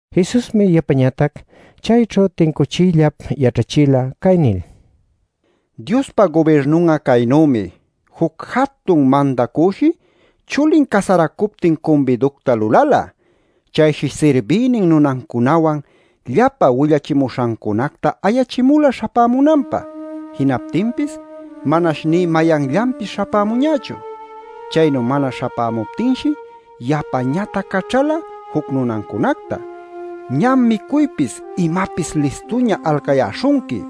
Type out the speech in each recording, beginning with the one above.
Jesusmi yapañatac chayćhu tincuchiyllap yaćhachila cay nil: “Diospa gubirnun'a caynümi. Juc jatun mandacüshi chulin casaracuptin cumbiducta lulala. Chayshi sirbïnin nunancunawan llapa willachimuśhancunacta ayachimula śhapämunanpä. Jinaptinpis manash nï mayanllanpis śhapämuñächu. “Chaynu mana śhapämuptinshi yapañatac caćhala juc nunancunacta: ‘¡Ñam micuypis imapis listuña alcayäśhunqui!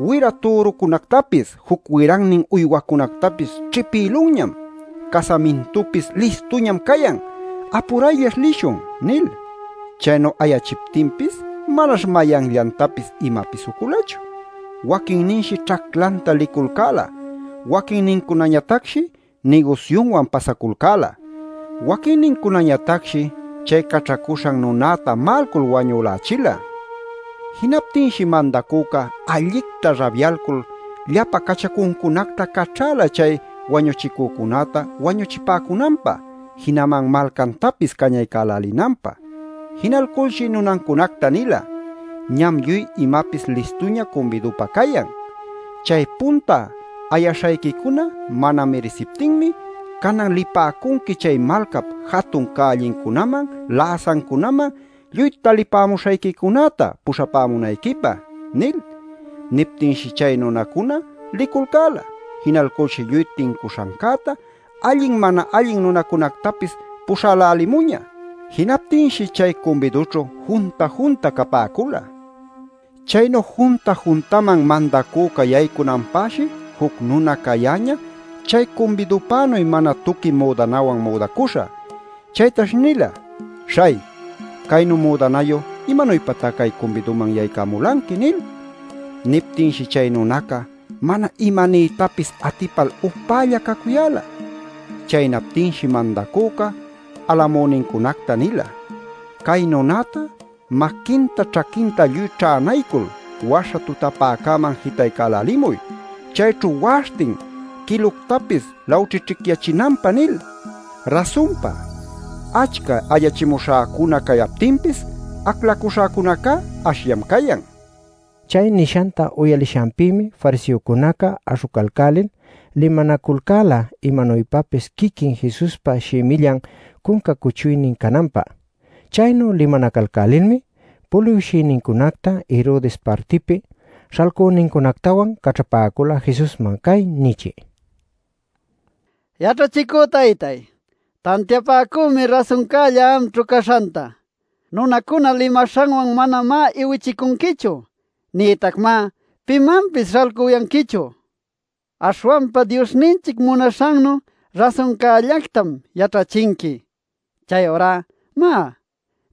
Wira türucunactapis juc wirannin uywacunactapis ćhipïlunñam; casamintupis listuñam cayan. ¡Apurayllash lishun!’ nil. “Chaynu ayachiptinpis manash mayanllantapis imapis uculachu. Waquinninshi ćhaclanta liculcäla, waquinnincunañatacshi nigusyunwan pasaculcäla. Waquinnincunañatacshi chay caćhacuśhan nunäta ma'alcul wañülächila. Jinaptinshi mandacüca allicta rabyalcul, llapa cachacuncunacta caćhäla chay wañuchicücunäta wañuchipäcunanpä, jinaman malcantapis cañaycälinanpä. “Jinalculshi nunancunacta nila: ‘Ñam lluy imapis listuña cumbidupä cayan. Chay punta ayaśhayquicuna mana mirisiptinmi canan lipäcunqui chay malcap jatun cällincunaman läsancunaman lluy talipämuśhayquicunäta puśhapämunayquipä’ nil. Niptinshi chay nunancuna liculcäla. Jinalculshi lluy tincuśhancäta allin, mana allin nunacunactapis puśhälälimuñä. Jinaptinshi chay cumbidućhu junta-junta capäcula. Chaynu junta-juntaman mandacüca yaycunanpäshi juc nuna cayäñä chay cumbidupänuy mana tuqui müdanawan müdacuśha. Chaytash nila: ‘Śhay, caynu müdanayu ¿imanuypatá cay cumbiduman yaycamulanqui?’ nil. Niptinshi chay nunaca mana imaniytapis atipal upälla cacuyäla. “Chaynaptinshi mandacüca alacamünincunacta nila: ‘Cay nunäta maquinta ćhaquinta lluy ćhänaycul waśha tutapäcäman jitaycälälimuy, chayćhu wa'aśhtin quiluctapis lawćhićhicyachinanpä’ nil. “Rasunpa achca ayachimuśhacuna cayaptinpis aclacuśhacunacá ashllam cayan” nin. Chay nishanta uyalishanpïmi fariseocunaca aśhucalcälil limanaculcäla imanuypapis quiquin Jesuspa shimillan cunca cuchuynin cananpä. Chaynu limanacalcälilmi puliwshïnincunacta Herodes partipi śhalcünincunactawan caćhapäcula Jesusman cay nichï: “Yaćhachicü taytáy, tantiapäcümi rasuncälla amćhu caśhanta. Nunacuna limaśhanwan manamá iwichicunquichu nïtacmá pimanpis śhalcuyanquichu. Aśhwanpa Diosninchic munaśhannu rasuncällactam yaćhachinqui. Chayurá má,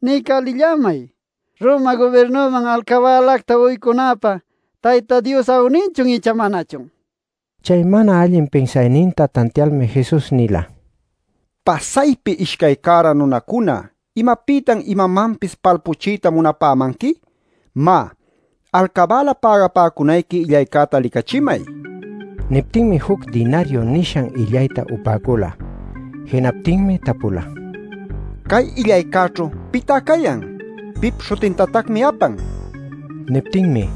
niycälillämay ¿Roma gubirnuman alcabälacta uycunapä Tayta Dios awninchun icha manachun?” nin. Chay mana allin pinsayninta tantialmi Jesus nila: “Pasaypi ishcay cära nunacuna ¿imapïtan imamanpis palpuchiyta munapämanqui? Má, alcabäla pägapäcunayqui illaycäta licachimay” nil. Niptinmi juc dinariu nishan illayta upäcula. Jinaptinmi tapula: “Cay illaycäćhu ¿pitá cayan? ¿Pip śhutintatacmi apan?” nil. Niptinmi: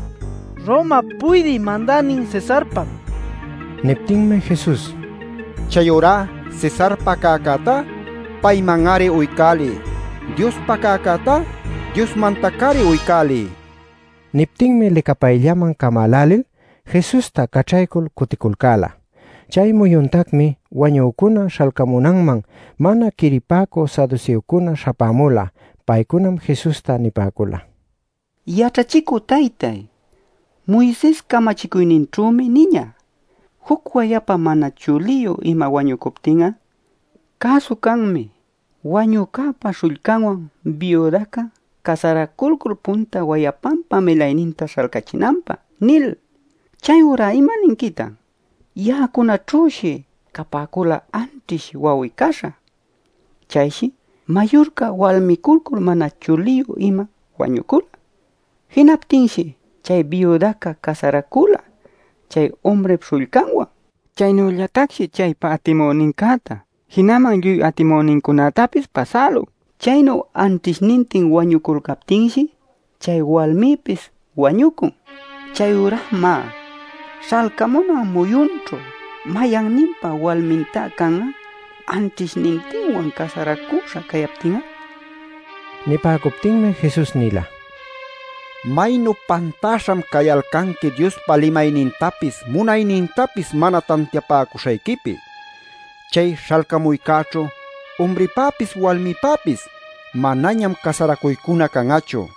“Romap Puydï Mandänin Cesarpam” nipäcula. Niptinmi Jesus: “Chayurá Cesarpa cäcätá, payman-ari uycäliy. Diospa cäcätá Diosmantac-ari uycäliy” nin. Niptinmi licapayllaman camälälil, Jesusta caćhaycul cuticulcäla. Chay muyuntacmi wañücuna śhalcamunanman mana quiripäcü saduseocunaca śhapämula. Paycunam Jesusta nipäcula: “Yaćhachicü taytay, Moises camachicuyninćhümi niñä: ‘Juc wayapa mana chuliyu ima wañucuptin'a, cäsu canmi wanücäpa śhullcanwan biudaca casaraculcul punta wayapanpa milayninta śhalcachinanpä’ nil. Chayurá ¿imaninquitan? Ya'acunaćhüshi capäcula anćhish wawi-caśha. Chayshi mayurca walmiculcul mana chuliyu ima wañucula. Jinaptinshi chay biudaca casaracula chay umrip śhullcanwan. Chaynüllatacshi chaypa atimünincäta jinaman lluy atimünincunätapis pasälun. Chaynu anćhishnintin wañuculcaptinshi chay walmipis wañucun. Chayurá má, śhalcamunan muyunćhu ¿mayanninpa walmintá can'a, anćhishnintinwan casaracuśha cayaptin'a?” nil. Nipäcuptinmi Jesus nila: “¡Maynu pantaśham cayalcanqui Diospa limaynintapis munaynintapis mana tantiapäcuśhayquipi! Chay śhalcamuycäćhu umripäpis walmipäpis manañam casaracuycuna can'achu.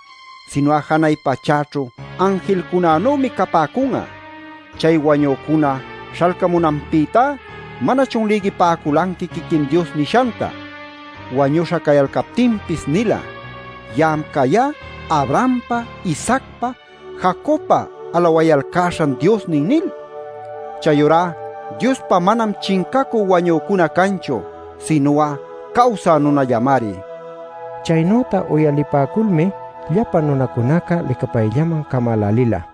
Sinu'a janay pachäćhu anjilcunanümi capäcun'a. Chay wañücuna śhalcamunanpïtá ¿manachun lïgipäculanqui quiquin Dios nishanta: Wañuśha cayalcaptinpis nila: ‘Ya'am cayá Abrahampa, Isaacpa, Jacobpa alawayalcäśhan Diosnin’ nil? Chayurá Diospá manam chincacü wañücuna canchu; sinu'a cawsä nunallamari” nil. Chaynüta uyalipäculmi llapa nunacunaca licapayllaman camälälila.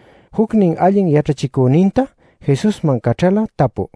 jucnin allin yaćhachicüninta Jesusman caćhala tapü: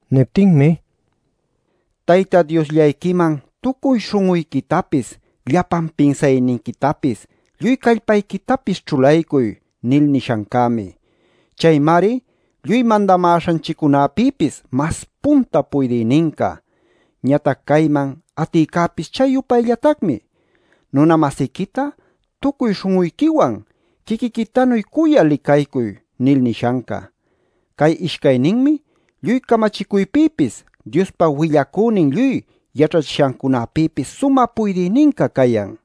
Niptinmi: “ ‘Tayta Diosllayquiman tucuy śhun'uyquitapis, llapan pinsayniquitapis, lluy callpayquitapis ćhulaycuy’ nil nishancämi. Caymari lluy mandamäśhanchiccunapïpis mas punta puydïninca. Ñatac cayman atïcäpis chay-yupayllatacmi: ‘Nuna-masiquita tucuy śhun'uyquiwan quiquiquitanuy cuyal licaycuy’ nil nishanca. Cay ishcayninmi lluy camachicuypïpis, Diospa willacünin lluy yaćhachishancunapïpis sumä puydïninca cayan” nila.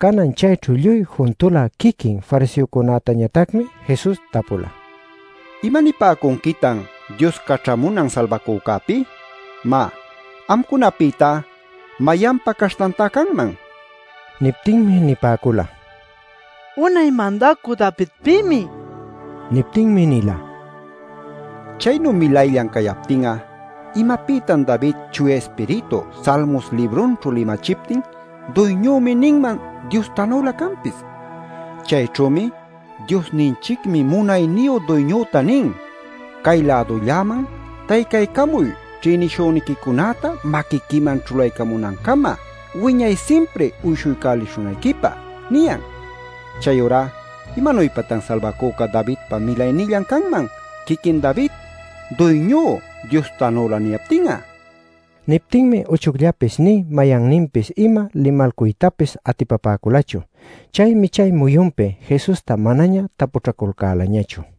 Canan chayćhu lluy juntula quiquin fariseocunätañatacmi Jesus tapula: “¿Imanipäcunquitan Dios Caćhamunan Salbacücäpi? Má, ¿amcunapïtá mayanpa caśhtantá canman?” nil. Niptinmi nipäcula: “Unay Mandacü Davidpïmi” nil. Niptinmi nila: “Chaynu milayllan cayaptin'a ¿imapïtan David Chuya Ispiritu Salmos librunćhu limachiptin ‘Duyñümi’ ninman Diostanülä canpis? Chayćhümi ‘Diosninchicmi munayniyu Duyñüta nin: “Cay-lädulläman taycaycamuy ćhïnishüniquicunäta maquiquiman ćhulaycamunäcama wiñay simpri uyshuycälishunayquipä” ’ niyan. “Chayurá ¿imanuypatan Salbacüca Davidpa milaynillan canman quiquin David ‘Duyñú’ Diostanülä niyaptin'a?” nil. Niptinmi uchucllapis nï mayanninpis ima limalcuytapis atipapäculachu. Chaymi chay muyunpi Jesusta manaña tapućhaculcälañachu.